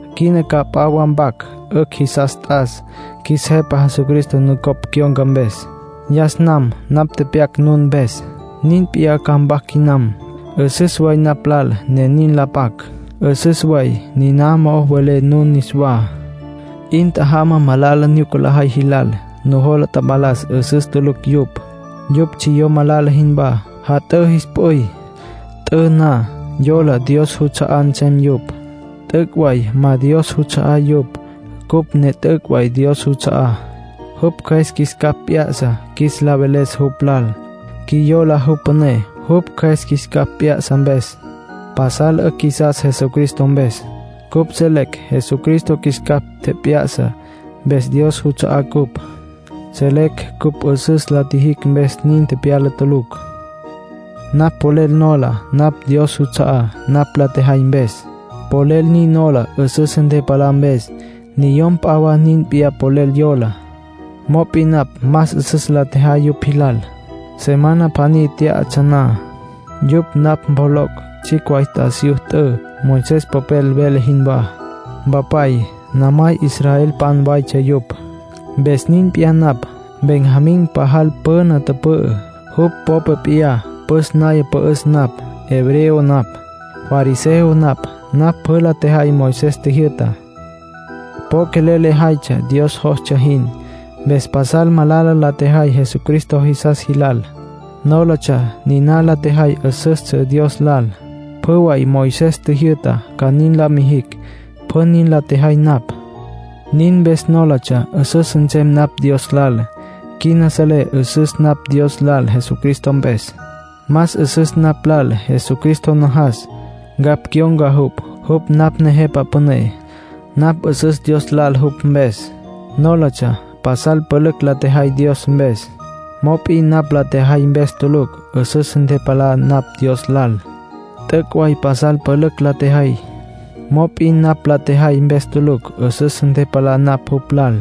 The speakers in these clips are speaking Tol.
Quina ca p'a wa mpac. 'Ücj jisas t'as, qjuis Jepa Jesucristo nucopj cyon̈ca mpes. Yas nam napj tepyac nun mpes. Nin p'iyá ca mpac quinam. 'Üsüs way napj lal ne nin la pac; 'üsüs way niná mo'o welé nun niswá. 'In tjajamá malala nyuca lajay jilal. Nujola tapalas 'üsüs tulucj yupj. Yupj tsjiyó malala jinwá. Jat'ǘ jis p'üy. T'ü na, yola Dios juts'a'á nsem yupj. T'üc' way ma Dios juts'a'á yupj. Cupj ne t'üc' way Dios juts'a'á; jupj Cjües qjuis capj p'ya'sa qjuis la veles jupj lal, qjuiyola jupj püné jupj Cjües qjuis capj p'ya'sa mpes. Pasal 'ücj qjuisas Jesucristo mpes. Cupj selecj Jesucristo qjuis capj tjep'ya'sa mpes Dios juts'a'á cupj; selecj cupj 'üsüs la tjijicj mpes nin tepyala tulucj. Napj polel nola napj Dios juts'a'á napj la tjejay mpes. Polel nin nola 'üsüs ntepalá mpes. Niyom p'a wa nin p'iyá polel yola. Mop'in napj más 'üsüs la tjejay yupj jilal. Semana pjaní tyatsja na, yupj napj mpjoloc' tsjicj way t'asiyú t'ü, Moisés popel vele jinwá. Mpapay, namay, israelpan waytsja yupj. Mpes nin p'iyá napj. Benjamín pajal püna tüpü'ü, jupj popa p'iyá püs naya pü'üs napj. Hebreo napj. Fariseo napj; napj pjü la tjejay Moisés tjijyü'tá. Po quelel lejaytsja Dios jostsja jin. Mpes pasal malala la tjejay Jesucristo jisas jilal. Nólatsja niná la tjejay 'üsüstsja Dios lal. Pjü way Moisés tjijyü'ta ca nin la mijicj, pjü nin la tjejay napj. Nin mpes nólatsja 'üsüs nsem napj Dios lal. Quina selé 'üsüs napj Dios lal Jesucristo mpes. Más 'üsüs napj lal Jesucristo najas, ncapj cyon̈ca jupj. Jupj napj Nejepa Püné. Napj 'üsüs Dios lal jupj mpes. Nólatsja pasal pülücj la tjejay Dios mpes, mop'in napj la tjejay mpes tulucj 'üsüs ntepalá napj Dios lal. T'üc' way pasal pülücj la tjejay, mop'in napj la tjejay mpes tulucj 'üsüs ntepalá napj jupj lal.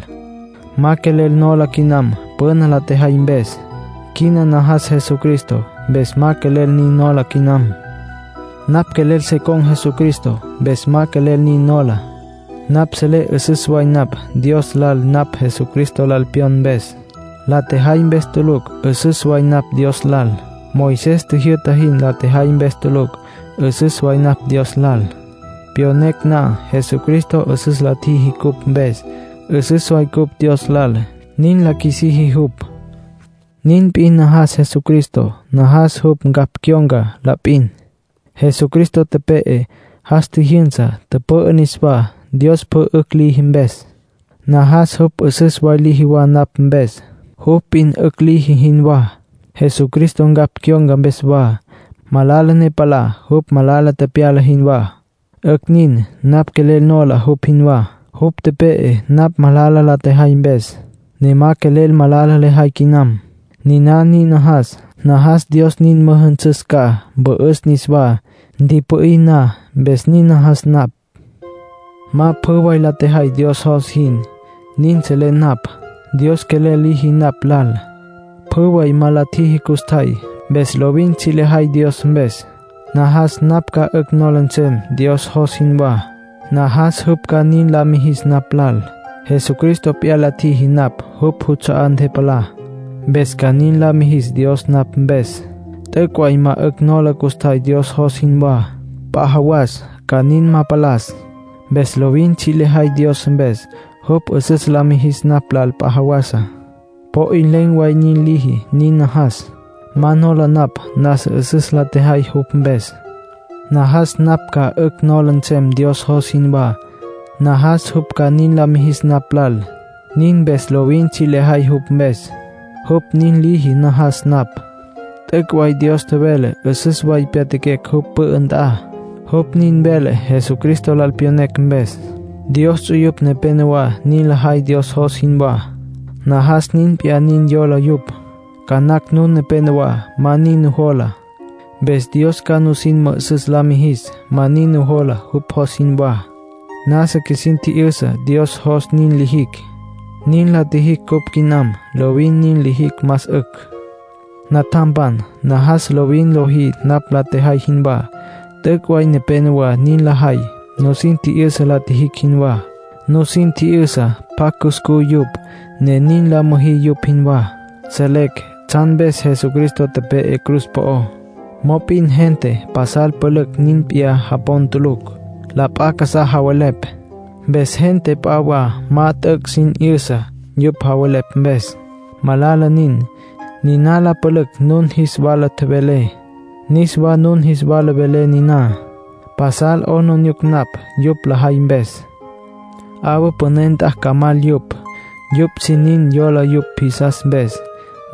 Ma quelel nola quinam püna la tjejay mpes. Quina najas Jesucristo, mpes ma quelel nin nola quinam. Napj quelel se con̈ Jesucristo, mpes ma quelel nin nola. Napj selé 'üsüs way napj Dios lal napj Jesucristo lal pyon mpes. La tjejay mpes tulucj 'üsüs way napj Dios lal. Moisés tjijyü'ta jin la tjejay mpes tulucj 'üsüs way napj Dios lal. Pyonecj na Jesucristo 'üsüs la tjiji cupj mpes, 'üsüs way cupj Dios lal, nin la qjuisiji jupj. Nin p'in najas Jesucristo; najas jupj ncapj cyon̈ca la p'in. Jesucristo tepe'e, jas tjijyünsa, tüpü'ü niswá, Dios pjü 'ücj liji mpes. Najas jupj 'üsüs way liji wa napj mpes, jupj p'in 'ücj liji jinwá. Jesucristo ncapj cyon̈ca mpes wa, malala ne palá jupj malala tepyala jinwá. 'Ücj nin. Napj quelel nola jupj jinwá. Jupj tepe'e napj malala la tjejay mpes, ne ma quelel malala lejay quinam. Niná nin najas; najas Dios nin müjünsüs ca, mpü'üs niswá, ntipü'í na, mpes nin najas napj. Ma pjü way la tjejay Dios jos jin, nin selé napj. Dios quelel liji napj lal, pjü way ma la tjiji custjay. Mpes lovin tsji' lejay Dios mpes; najas napj ca 'ücj nola nsem Dios jos jinwá. Najas jupj ca nin la mijis napj lal. Jesucristo p'iyá la ntjiji napj jupj juts'a'á ntepalá, mpes ca nin la mijis Dios napj mpes. T'üc' way ma 'ücj nola custjay Dios jos jinwá. P'a jawas ca nin ma palas. Mpes lovin tsji' lejay Dios mpes. Jupj 'üsüs la mijis napj lal p'a jawasa, po 'in len̈ way nin liji, nin najas. Ma nola napj nasa 'üsüs la tjejay jupj mpes. Najas napj ca 'ücj nola nsem Dios jos jinwá; najas jupj ca nin la mijis napj lal. Nin mpes lovin tsji' lejay jupj mpes. Jupj nin liji najas napj. T'üc' way Dios tjevele 'üsüs way pyatjaquecj jupj pü'ü nt'a. Jupj nin vele Jesucristo lal pyonecj mpes. Dios ts'uyupj nepenowá nin lajay Dios jos jinwá; najas nin p'iyá nin yola yupj. Ca nacj nun nepénowa ma nin nujola. Mpes Dios ca nusin mü'üsüs la mijis ma nin nujola jupj jos jinwá. Nasa qjuisin tji'yüsa Dios jos nin lijicj. Nin la tjijicj cupj quinam. Lovin nin lijicj más 'ücj. Natjampan, najas lovin lojí napj la tjejay jinwá. T'üc' way nepénowa nin lajay, nusin tji'yüsa la tjijicj jinwá. Nusin tji'yüsa pjacj cuscú yupj, ne nin la müjí yupj jinwá. Selecj tsjan mpes Jesucristo tepe'e cruz po'ó. Mop'in gente pasal pülücj nin p'iyá japon tulucj. La p'a casá javelepj. Mpes gente p'a wa ma t'üc' sin 'yüsa, yupj javelepj mpes. Malala nin. Niná la pülücj nun jis wala tjevelé. Niswa nun jis wala velé niná. Pasal 'aplijila napj yupj lajay mpes. 'Awa püné nt'a ca mal yupj. Yupj sin nin yola yupj jisas mpes;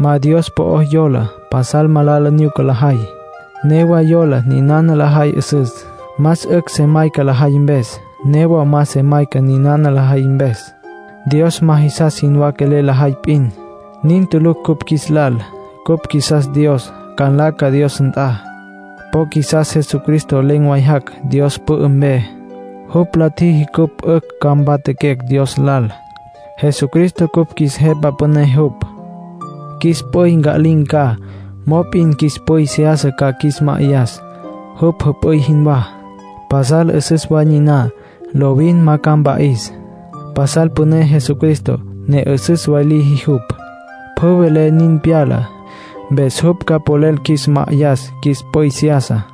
ma Dios po'o yola. Pasal malala nyuca lajay. Newa yola ninana lajay 'üsüs. Más 'ücj se mayca lajay mpes, newa ma se mayca ninana lajay mpes. Dios ma jisas jinwá quelel lajay p'in. Nin tulucj cupj qjuis lal. Cupj qjuisas Dios, ca nlaca Dios nt'a. Po qjuisas Jesucristo len̈ way jac' Dios pü'ü mpe. Jupj la tjiji cupj 'ücj ca mpatjaquecj Dios lal. Jesucristo cupj qjuis Jepa Püné jupj. Qjuis p'üy nca'lin̈ ca. Mop'in qjuis p'üy seyasa ca qjuis ma'ayas, jupj jüp'üy jinwá. Pasal 'üsüs way niná, lovin ma ca mpa'is. Pasal püné Jesucristo, ne 'üsüs way liji jupj. Pjü vele nin pyala. Mpes jupj ca polel qjuis ma'ayas qjuis p'üy seyasa.